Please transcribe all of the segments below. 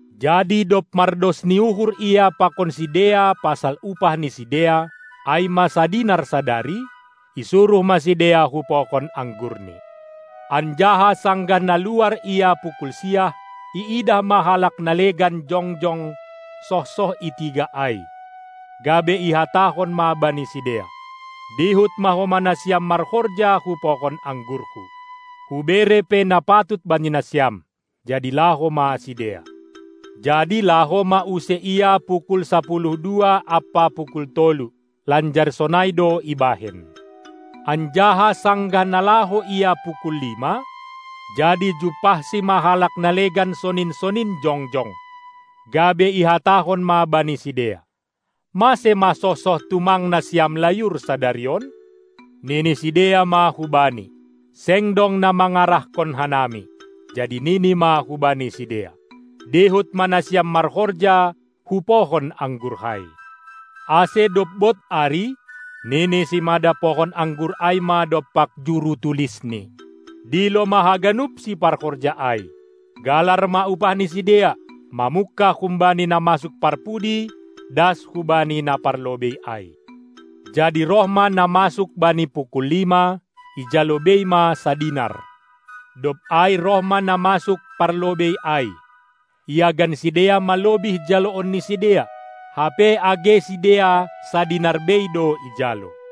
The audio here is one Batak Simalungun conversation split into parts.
Jadi dob mardos ni uhur ia pakon sidea pasal upah ni sidea, ai ma sadinar sadari, isuruh ma sidea hu pohon anggurni. Anjaha sanggah na luar ia pukul siah, iidah ma halak na legan jongjong sohsoh i tiga ai, gabe ihatahon ma bani sidea: Dihut ma homa nasiam marhorja hu pohon anggurhu! Hubere pe na patut bani nasiam! Jadi laho ma sidea. Jadi laho ma use ia pukul sapuluh dua ampa pukul tolu, lanjar sonai do ibahen. Anjaha sanggah na laho ia pukul lima, jadi jumpahsi ma halak na legan sonin-sonin jongjong, gabe ihatahon ma bani sidea: Mase ma sohsoh tumang nasiam layur sadari on? Nini sidea ma hubani: Seng dong na mangarahkon hanami. Jadi nini ma hubani sidea: Dihut ma nasiam marhorja hu pohon anggurhai! Ase dob bod ari, nini simada pohon anggur ai ma dompak juru tulisni: Dilo ma haganup siparhorja ai, galar ma upah ni sidea, mamungkah humbani na masuk parpudi das hubani na parlobei ai! Jadi roh ma na masuk bani pukul lima, ijalo bei ma sadinar. Dob ai roh ma na masuk parlobei ai, iagan sidea ma lobih jaloon ni sidea, hape age sidea sadinar bei do ijalo.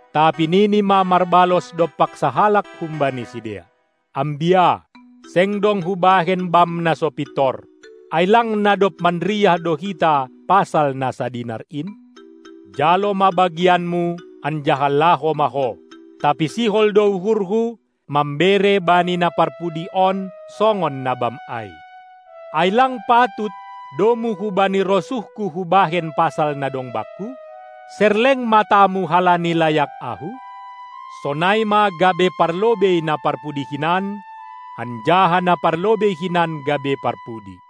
Tapi nini ma marbalos dompak sahalak humbani sidea: Ambia, seng dong hubahen bam na so pintor! Ai lang na dob manriah do hita pasal na sadinar in! Jalo ma bagianmu anjaha laho ma ho! Tapi sihol do uhurhu, mambere bani na parpudi on songon na bam ai. Ai lang patut, domu hubani rosuhku hubahen pasal na dong bakku? Serleng matamu halani layak ahu? Sonai ma gabe parlobei na parpudi hinan, anjaha na parlobei hinan gabe parpudi.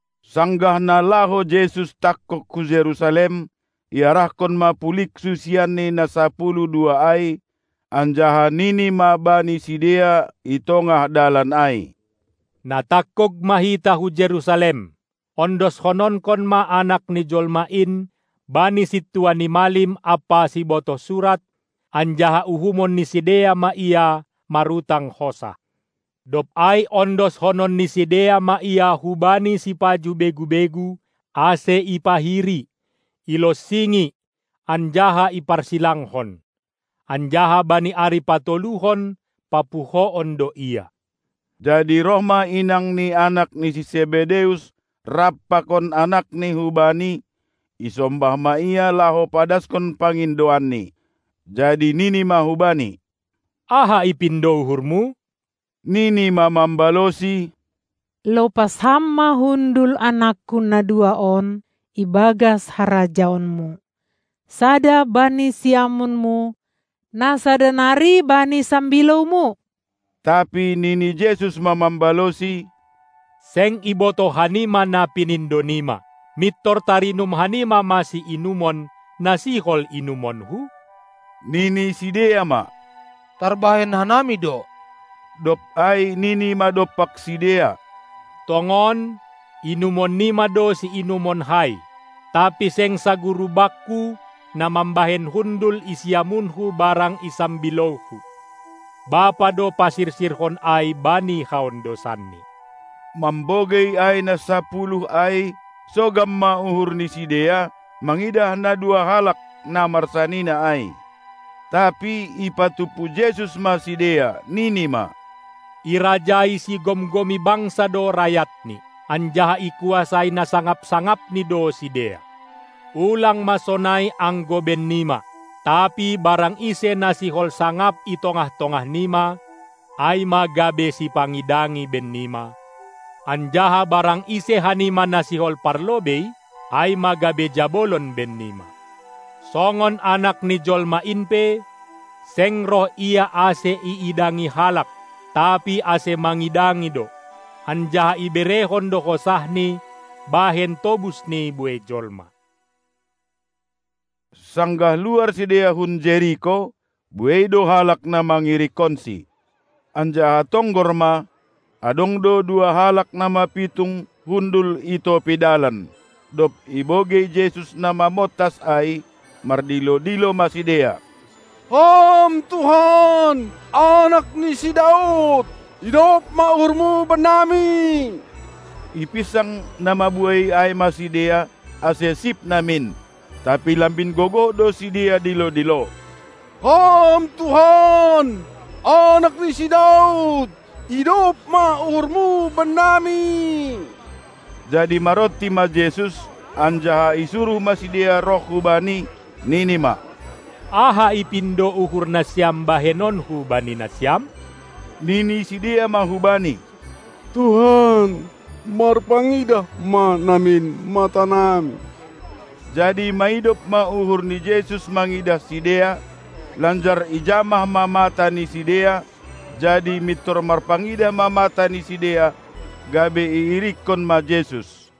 Sanggah na laho Jesus tangkog hu Jerusalem, iarahkon ma pulig susianNi na sapuluh dua ai, anjaha nini ma bani sidea i tongah dalan ai: Na tangkog ma hita hu Jerusalem, ondoskononkon ma Anak ni jolma in bani sintua ni malim ampa sibotoh surat, anjaha uhumon ni sidea ma Ia marutang hosah. Dob ai ondoskonon ni sidea ma Ia hubani sipajuh begu-begu, ase ipahiri, ilonsingi anjaha iparsilangkon, anjaha bani ari patoluhon papuhoon do Ia. Jadi roh ma inang ni anak ni si Sebedeus rap pakon anakni hu Bani, isombah ma Ia laho padaskon pangindoanni. Jadi nini ma hubani: Aha ipindo uhurmu? Nini ma mambalosi: Lopas Ham ma hundul anakku na dua on ibagas harajaonMu, sada bani siamunMu, na sada nari bani sambilouMu! Tapi nini Jesus ma mambalosi: Seng ibotoh hanima na pinindonima. Mintor tarinum hanima ma siinumon, na sihol inumonKu? Nini sidea ma: Tarbahen hanami do! Dob ai nini ma dompak sidea: Tongon, inumonnima do siinumonKai, tapi seng saguru Bakku na mambahen hundul i siamunHu barang i sambilouHu; Bapa do pasirsirhon ai bani haondosanni. Mambogei ai na sapuluh ai, sogam ma uhur ni sidea mangidah na dua halak na marsanina ai. Tapi ipatumpu Jesus ma sidea, nini ma: Irajai sigomgomi bangsa do rayatni, anjaha ikuasai na sangap-sangapni do sidea. Ulang ma sonai anggo bennima, tapi barang ise na sihol sangap i tongah-tongahnima, ai ma gabe sipangidangi bennima, anjaha barang ise hanima na sihol parlobei, ai ma gabe jabolon bennima. Songon Anak ni Jolma in pe, seng roh Ia ase iidangi halak, tapi ase mangidangi do, anjaha iberehon do hosahNi bahen tobus ni buei jolma. Sanggah luar sidea hun Jeriko, buei do halak na mangirikkonSi. Anjaha tonggor ma, adong do dua halak na mapitung hundul i topi dalan; dob ibogei Jesus na mamontas ai, mardilo-dilo ma sidea: Ham Tuhan, Anak ni si Daud, idop ma uhurMu bennami! Ipinsang na mabuei ai ma sidea ase sip namin, tapi lambin gogoh do sidea dilo-dilo: Ham Tuhan, anak ni si Daud, idop ma uhurMu bennami! Jadi maronti ma Jesus anjaha isuruh ma sidea roh hu Bani, nini ma: Aha ipindo uhur nasiam bahenonKu bani nasiam? Nini sidea ma hu Bani: Tuhan marpangidah ma namin matanami! Jadi maidop ma uhur ni Jesus mangidah sidea, lanjar ijamah ma mata ni sidea; jadi mintor marpangidah ma matani sidea, gabe iirikkon ma Jesus.